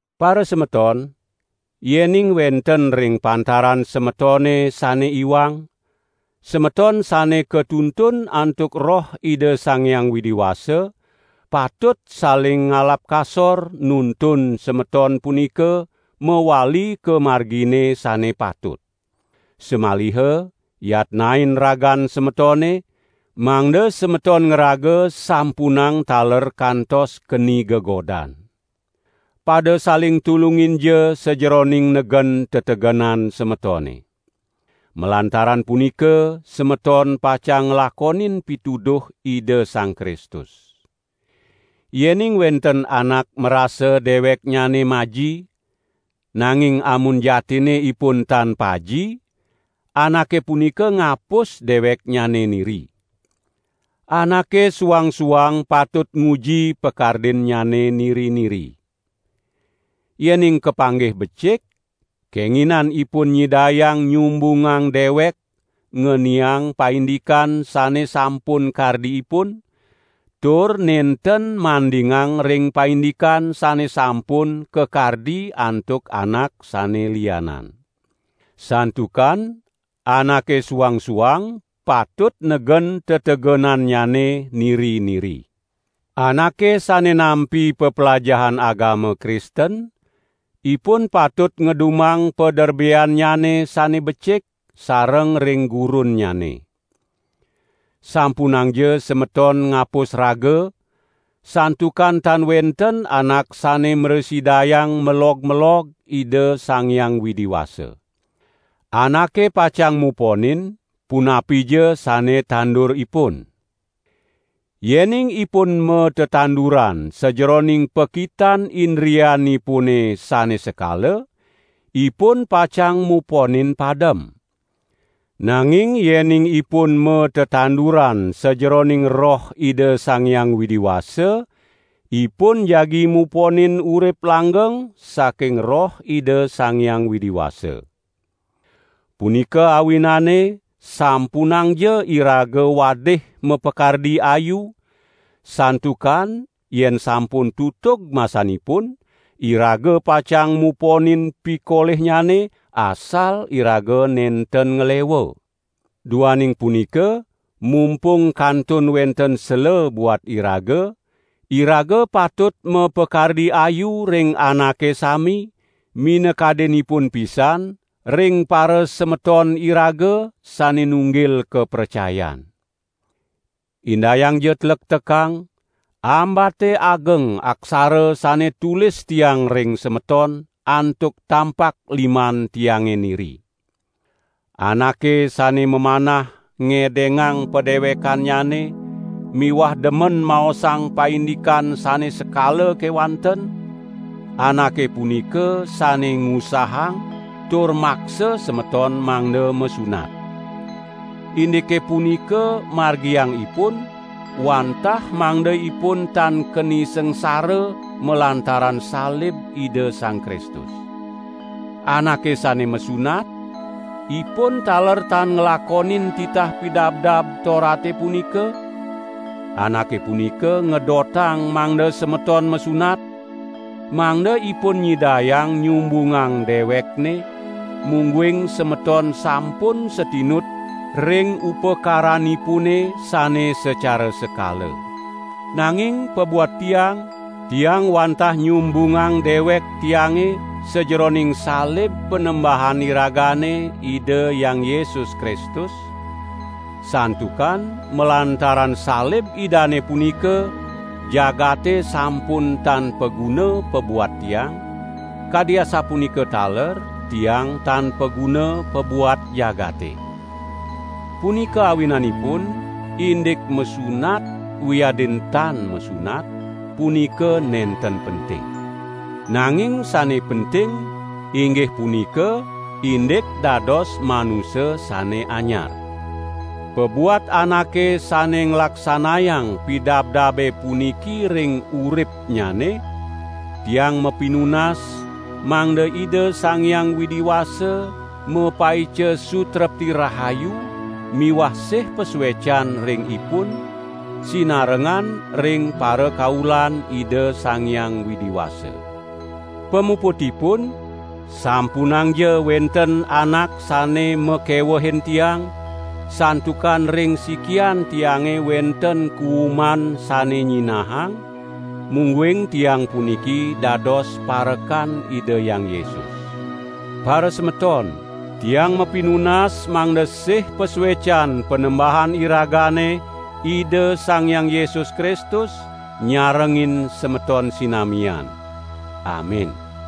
Parasemeton, yening wenten ring pantaran semetone sane iwang, semeton sane katuntun antuk Roh Ida Sang Hyang Widi Wasa, patut saling ngalap kasor nuntun semeton punika mawali ka margine sane patut. Samaliha yatnain ragan semetone, mangda semeton ngraga sampunang taler kantos keni gegodan. Pada saling tulunginja sajeroning negen tetegenan semetone. Malantaran punika semeton pacang nglakonin pituduh Ida Sang Kristus. Yening wenten anak marasa deweknyane maji, nanging amun jatinne ipun tan paji, anake punika ngapus deweknyane niri. Anake suang-suang patut nguji pakardinnyane niri-niri. Yening kapanggih becik, kenginan ipun nyidayang nyumbungang dewek ngeniang paindikan sane sampun kardi ipun, tur nenten mandingang ring paindikan sane sampun kakardi antuk anak sane lianan. Santukan anake suang-suang patut negen tetegenannyane niri-niri. Anake sane nampi peplajahan agama Kristen, ipun patut ngedumang paderbeannyane sane becik sareng ring gurunnyane. Sampunangja semeton ngapus raga, santukan tan wenten anak sane mrasidayang melog-melog Ida Sang Hyang Widi Wasa. Anake pacang muponin punapija sane tandur ipun. Yening ipun matanduran sajeroning pakitan indrianipune sane sekala, ipun pacang muponin padem. Nanging yening ipun matanduran sajeroning Roh Ida Sang Hyang Widi Wasa, ipun jagi muponin urip langgeng saking Roh Ida Sang Hyang Widi Wasa. Punika awinane sampunangja iraga wadih mapakardi ayu, santukan yen sampun tutug masanipun, iraga pacang muponin pikolihnyane, asal iraga nenten nglewa. Duaning punika, mumpung kantun wenten sela buat iraga, iraga patut mapakardi ayu ring anake sami, minakadinipun pisan ring parasemeton iraga sane nunggil kapracayan. Indayangja tlektekang, ambate ageng aksara sane tulis tiang ring semeton, antuk tampak liman tiange niri. Anake sane mamanah ngedengang padewekannyane miwah demen maosang paindikan sane sekala kewanten, anake punika sane ngusahang tur maksa semeton mangda masunat. Indike punika margiang ipun, wantah mangda ipun tan keni sangsara malantaran salib Ida Sang Kristus. Anake sane masunat, ipun taler tan nglakonin titah Pidabdab Torate punika; anake punika ngedotang mangda semeton masunat, mangda ipun nyidayang nyumbungang dewekne mungguing semeton sampun satinut ring upakaranipune sane sacara sekala. Nanging pabuat tiang, tiang wantah nyumbungang dewek tiange sajeroning salib Panembahan iragane Ida Hyang Yesus Kristus, santukan malantaran salib Idane punika, jagate sampun tan paguna pabuat tiang, kadi asapunika taler tiang tan paguna pabuat jagate. Punika awinanipun, indik masunat, wiadin tan masunat, punika nenten penting. Nanging sane penting, inggih punika indik dados manusa sane anyar. Pabuat anake sane nglaksanayang pidabdabe puniki ring uripnyane, tiang mapinunas mangda Ida Sang Hyang Widi Wasa mapaica sutrepti rahayu miwah sih pasuecan ring ipun, sinarengan ring parakaulan Ida Sang Hyang Widi Wasa. Pamuputipun, sampunangja wenten anak sane makewehin tiang, santukan ring sikian tiange wenten kuwuman sane nyinahang, mungguing tiang puniki dados parekan Ida Hyang Yesus. Parasemeton, tiang mapinunas mangda sih pasuecan Panembahan iragane Ida Sang Hyang Yesus Kristus, nyarengin semeton sinamian. Amin!